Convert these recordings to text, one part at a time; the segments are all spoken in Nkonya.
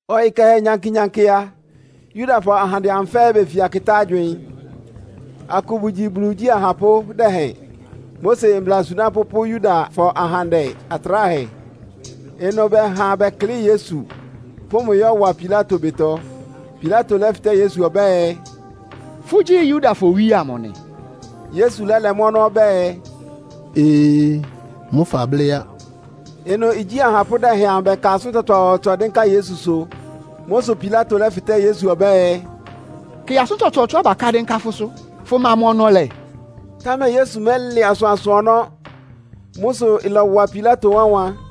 Ɔyɩ kɛhɛ nyankɩ-nyankɩ a, Yudafɔ ahandɛ-ahandɛ amʋ fɛ́ɛ́ befia kɩtá agywɩɩn. Akʋ bʋgyi, Bulu igyí ahapʋ́ dɛhɛn, Mose mbla asunápʋ́ pʋ́ Yudafɔ ahandɛ atráhɛ. Ɩnʋ bɛha bɛklɩ́ɩ Yesu, pʋ́ mʋ yɔ́wa Pilato ɩbɩtɔ. Pilato lɛ́fɩtɛ́ Yesu ɔbɛ́ɛ, “Fʋ́gyí Yudafɔ owíe amʋ nɩ?” Yesu lɛ́lɛ mʋ́ ɔnɔ́ ɔbɛ́ɛ, “Ee, mʋ́ fablɩ́ á!” Ɩnʋ igyí ahapʋ́ dɛhɛn amʋ bɛka asʋ́n tsɔtsɔɔtsɔ dɩ́nká Yesusʋ. Mʋ́ sʋ Pilato lɛ́fɩtɛ́ Yesu ɔbɛ́ɛ, “Kɩ asʋ́n tsɔtsɔɔtsɔá baká dɩ́nká fʋ́sʋ́, fʋma mʋ́ ɔnɔ́ lɛ́?” Támɛ Yesu mɛlɛ asʋansʋ ɔnɔ́. Mʋ sʋ ɩlɔwa Pilato wánwan.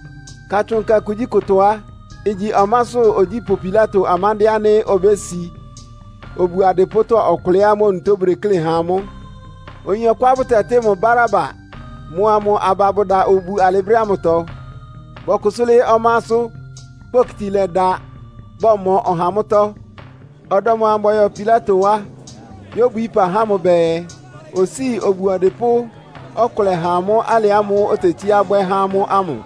Katsʋn Nkɛ kugyíkʋtɔ á, igyi ɔmásʋ́ ogyípʋ́ Pilato amándɩ́ɛ́ ánɩ́ obési obu adɩpʋ́tɔ́ ɔkʋlɛá amʋ́ onutó bʋdeklé há amʋ́. Oyin ɔkʋá bʋtɛtɩ́ mʋ Baraba mʋa mʋ aba bʋda obu alɩ brɛ́ ámʋtɔ. Bɔkʋsʋ́ lɩ́ɩ́ ɔmásʋ́, kpokiti lɛ́da, bɔmɔ ɔha mʋ́tɔ́. Ɔdɔm amʋ́ʋ́ bɔyɔ Pilato wá yóbwií ɩpa há mʋ bɛɛ, osíi obu ɔdɩpʋ́ ɔkʋlɛ ha amʋ́ alɩ ámʋ́ʋ́ otetsíá bwɛ́ há amʋ́ ámʋ.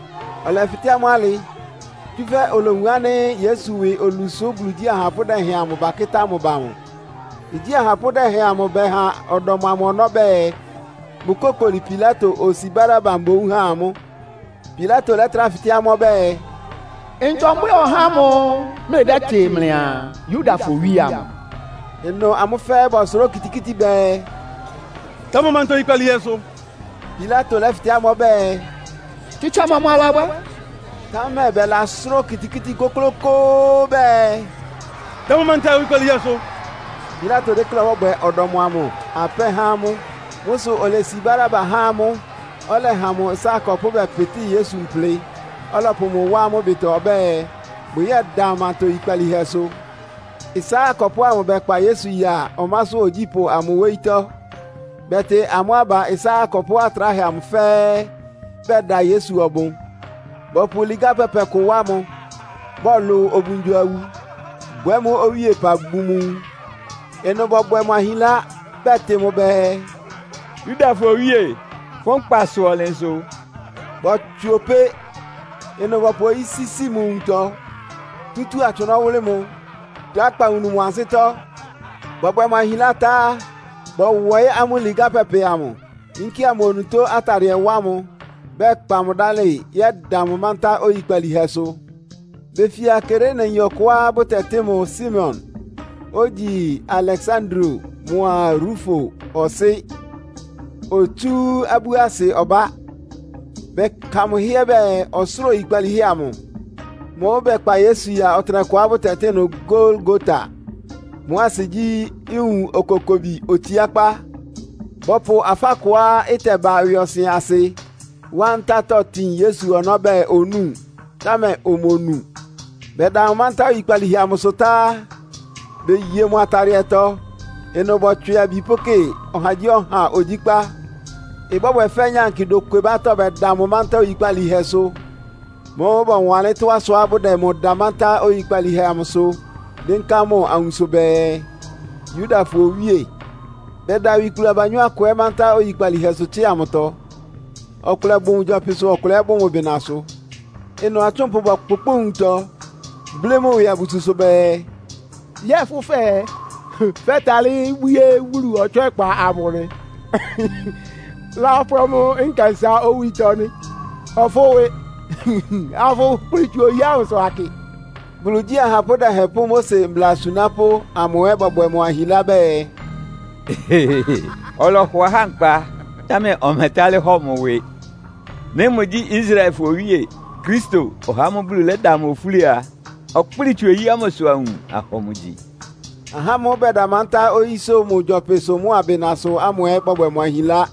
Ɔlɛfɩtɛ́ amʋ́ alɩ, tsúfɛ́ olowun ánɩ́ Yesu ɩwɩ olu sʋ́ Bulu igyí ahapʋ́ dɛhɛn amʋ bakɩ́tá mʋ ba mʋ. Igyí ahapʋ́ dɛhɛn amʋ bɛha ɔdɔm amʋ ɔnɔ́ bɛɛ, bʋkókoli Pilato, osi Baraba mboún ha amʋ́. Pilato lɛ́trá fɩtɛ́ amʋ́ ɔbɛ́ɛ, “Ntɔ mbwɛ́ɛ ɔhá ámʋ́ʋ́ mlɩdɛ́tɩ mlɩaa, Yudafɔ Owíe amʋ?” Ɩnʋ amʋ́ fɛ́ɛ́ bɔsʋrá okitikíti bɛɛ, “Da mʋ manta oyikpalíhɛsʋ!” Pilato lɛ́fɩtɛ́ amʋ́ ɔbɛ́ɛ, “Tsitsa mɔmʋ alabwɛ́?” Támɛ bɛlasʋ́rá okitikíti kʋ́klʋ́kʋ́ʋ́ bɛɛ “Da mʋ manta oyikpalíhɛsʋ!” Pilato dékléá ɔbɔ́bwɛ ɔdɔm amʋ apɛ́ há amʋ́. Mʋ́ sʋ olesi Baraba há amʋ́, ɔlɛha mʋ ɩsá akɔpʋ́ bɛpɩtɩ́ Yesu mplɩ, ɔlɔpʋ mʋ wá amʋ́ ɩbɩtɔ ɔbɛ́ɛ, bʋyɛ́da mʋ manta oyikpalíhɛsʋ. Ɩsá akɔpʋ́ ámʋ bɛkpa Yesu ya ɔmásʋ́ ogyípʋ́ amʋ wóyítɔ́. Bɛtɩ amʋ́ aba ɩsá akɔpʋ́ atráhɛ amʋ fɛ́ɛ́, bɛda Yesu ɔbʋn. Bɔpʋ ligá pɛpɛ kʋ wá mʋ, bɔlʋ obungyo-awu, bwɛ́ mʋ́ owíepa bun mʋ nwun. Ɩnʋ bɔbwɛ mʋ ahinlá, bɛtɩ mʋ bɛɛ, “Yudafɔ Owíe, fʋ́ nkpasʋ ɔnlɩnsʋ!” Bɔtswɩ opé! Ɩnʋ bɔpʋ oyí sísi mʋ nwuntɔ, tutúu atsʋnɔ́ wʋ́lɩ́ mʋ, dá akpawunu mʋ ansɩ́tɔ́. Bɔbwɛ mʋ ahinlá tá á, bɔwɔɩ́ amʋ́ ligá pɛpɛ amʋ, yínkía mʋ onutó atadɩɛ wá mʋ, bɛkpa mʋ dálɩ bɛyɛ́da mʋ mántá oyikpalíhɛsʋ. Befia Kireneyin ɔkʋá bʋtɛtɩ́ mʋ Simon, ogyi Aleksandro mʋa Rufo ɔsɩ́. Otsú abú asɩ ɔbá, bɛka mʋ hɩ́ɛ́ bɛɛ, ɔsʋ́ra oyikpalíhɛ amʋ. Mʋ́ʋ́ bɛkpa Yesu ya ɔtɩnɛkʋá bʋtɛtɩ́ ɩnʋ Golgota. Mʋ́ asɩ gyí, “Nwun Okokobi Otsiákpá.” Bɔpʋ afá kʋá ɩtɛba ɩwɩɔsɩn asɩ wá ntátɔ́ tin Yesu ɔnɔ́ bɛɛ onúu, támɛ omonu. Bɛda mʋ mántá oyikpalíhɛ amʋsʋ tá á, beye mʋ atadɩɛtɔ. Ɩnʋ bɔtswɩ abi pʋ́kɩ ɔhagyíɔha ogyíkpá. Ɩbɔ́bwɛ fɛ́ nyankɩ dokwebátɔ́ bɛda mʋ mántá oyikpalíhɛsʋ. Mʋ́ʋ́ bɔwanlɩ́n tɔ́á sʋá bʋdɛ mʋ da mántá oyikpalíhɛ amʋsʋ dɩ́nká mʋ awunso bɛɛ, “Yudafɔ Owíe.” Bɛda awikplu abanyɔ́ akʋ ɛ́ mántá nyikpalíhɛsʋ tsɩ́a mʋtɔ. Ɔkʋlɛ bʋ mʋ gyɔpɩsʋ, ɔkʋlɛ ɛ́ bʋ mʋ bɩnasʋ. Ɩnʋ atsʋ́npʋ bɔkpʋkpʋ́ʋ nwuntɔ, blɩ́ mʋ ɩwɩ abususʋ bɛɛ, “Yɛ́ɛ fʋ́ fɛɛ, fɛ́talɩ́ bwíé Bulu ɔtswɛ́kpa amʋ, lápwɛ́ mʋ nkɛnsá owítɔ́ nɩ́? Hɔ fʋ́ ɩwɩ, afʋkplɩ tsu oyí ámʋsʋ akɩ!” Bulu igyí ahapʋ́ dɛhɛn pʋ́ Mose mbla asunápʋ́ amʋ ɛ́ bɔbwɛ mʋ ahinlá bɛɛ, “Ɔlɔhɔ ahá nkpa, támɛ ɔmɛtálɩ́ hɔ mʋ ɩwɩ. Nɩ́ mʋgyí Israelfɔ owíe, Kristo, (ɔhá ámʋ́ʋ́ Bulu lɛ́da mʋ ofúli) a, ɔkplɩ́ɩ tsu oyí ámʋsʋ awun, ahɔ mʋ gyi!” Ahá ámʋ́ʋ́ bɛda mántá oyísʋ́ mʋ gyɔpɩsʋ mʋ́a bɩnasʋ ámʋ ɛ́ bɔbwɛ mʋ ahinlá.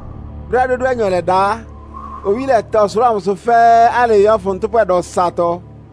Brɛ́á dódúanyɔ lɛda á, owí lɛta ɔsʋlʋ́ʋ amʋsʋ fɛ́ɛ́ alɩɩ yɔ́fʋn ntʋ́pwɛ dɔsatɔ.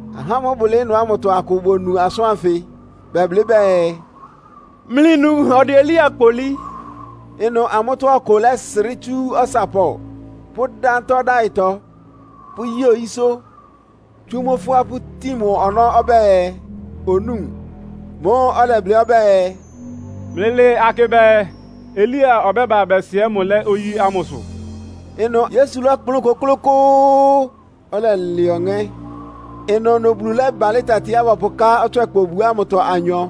Ahá amʋ́ʋ́ bʋlɩɩ́ ɩnʋ ámʋtɔ akʋ bonu asʋ́n ánfɩ, bɛblɩ́ bɛɛ, “Mlɩnu, ɔdɛ Elia kpolí.” Ɩnʋ amʋ́tɔ́ ɔkʋ lɛ́srɩ́ tsú ɔsapɔ, pʋ́dá ntá ɔdáɩtɔ, pʋ́yi oyísʋ́, tsú mʋ́ fʋ́a pʋ́tin mʋ ɔnɔ́ ɔbɛ́ɛ, onúu. Mʋ́ʋ́ ɔlɛblɩ́ ɔbɛ́ɛ, “Mlɩlɩɩ akɩ bɛɛ, Elia ɔbɛ́ba bɛsɩɛɩ́ mʋ lɛ́ oyí ámʋsʋ?” Ɩnʋ Yesu lɔ́kplʋn kʋ́klʋ́kʋ́ʋ́, ɔlɛlɛ ɔŋɛ́. Ɩnʋnʋ Bulu lɛ́balɩ́ tatiá bɔpʋká ɔtswɛ́kpa obu ámʋtɔ anyɔ,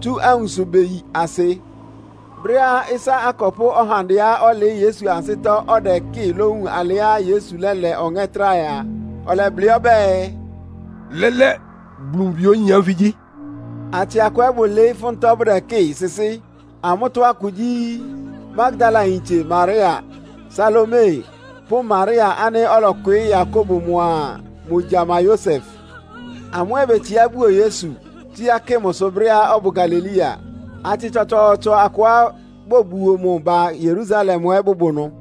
tsú awunso beyi asɩ. Brɛ́á ɩsá akɔpʋ́ ɔhandɛá ɔlɩɩ́ Yesu ansɩ́tɔ́ ɔdɛkɩ́ɩ lówun alɩá Yesu lɛ́lɛ ɔŋɛ́ tráhɛ a, ɔlɛblɩ́ ɔbɛ́ɛ “Lɛ́lɛ́, Bulu mʋ Bi oyin ánfɩ gyí!” Atsɩ akʋ ɛ́ bʋlɩɩ́ ɩfʋ́ntɔ́ bʋdɛkɩ́ɩ sɩsɩ́. Amʋ́tɔ́ akʋ gyí, Magdalayintse Maria, Salome pʋ́ Maria ánɩ́ ɔlɔkwɩɩ́ Yakobo mʋa mʋ gyama Yosef. Amʋ́ ɛ́ betsiá buo Yesu, tsíá kɩ mʋsʋ brɛ́á ɔbʋ Galilea. Atsɩ tsɔtsɔɔtsɔ akʋá bobuo mʋ ba Yerusalem ɛ́ bʋbʋ ɩnʋ.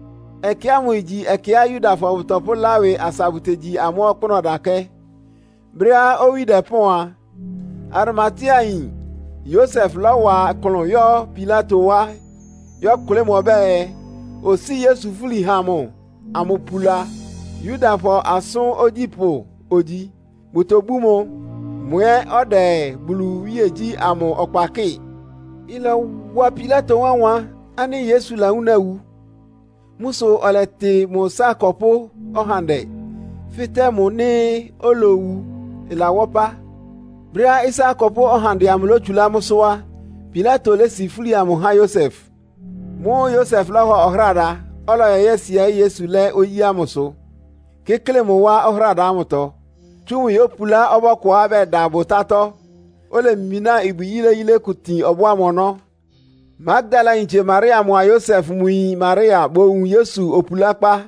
Ɛkɛ ámʋ igyi ɛkɛá Yudafɔ bʋtɔpʋ́lá ɩwɩ asa bʋtegyi amʋ́ ɔkpʋ́nʋ́ ɔdakɛ́. Brɛ́á owí dɛpɔ́ɔn a, Arimateayin Yosef lɔ́wa ɩklʋn yɔ́ Pilato wá yɔ́kʋlɩ́ mʋ ɔbɛ́ɛ, osíi Yesu fúli ha mʋ amʋpula. Yudafɔ asʋ́n ogyípʋ́ ogyi, bʋtobú mʋ. Mʋ ɛ́ ɔdɛ Bulu iwíegyí ámʋ ɔkpa kɩ́ɩ. Ɩlɔwa Pilato wánwan ánɩ́ Yesu lawúna wu. Mʋ́ sʋ ɔlɛtɩ mʋ ɩsá akɔpʋ́ ɔhandɛ, fɩ́tɛ́ mʋ nɩ́ olowu ɩlawá ɔpá. Brɛ́á ɩsá akɔpʋ́ ɔhandɛ amʋ lótsulá mʋ́sʋ́ á, Pilato lési fúli amʋ há Yosef. Mʋ́ʋ́ Yosef lɔ́hɔ ɔhráda, ɔlɔyɔ yɛ́sɩɛɩ́ Yesu lɛ́ oyí ámʋsʋ, kɩ́klɩ mʋ wá ɔhráda ámʋtɔ, tsú mʋ yópulá ɔbɔ́ kʋá bɛda bʋtátɔ́, olemináa ibwi yíléyílé kʋ tin ɔbɔ́ ámʋ ɔnɔ́. Magdalayintse Maria mʋa Yosef mʋ yin Maria bowun Yesu opulákpá.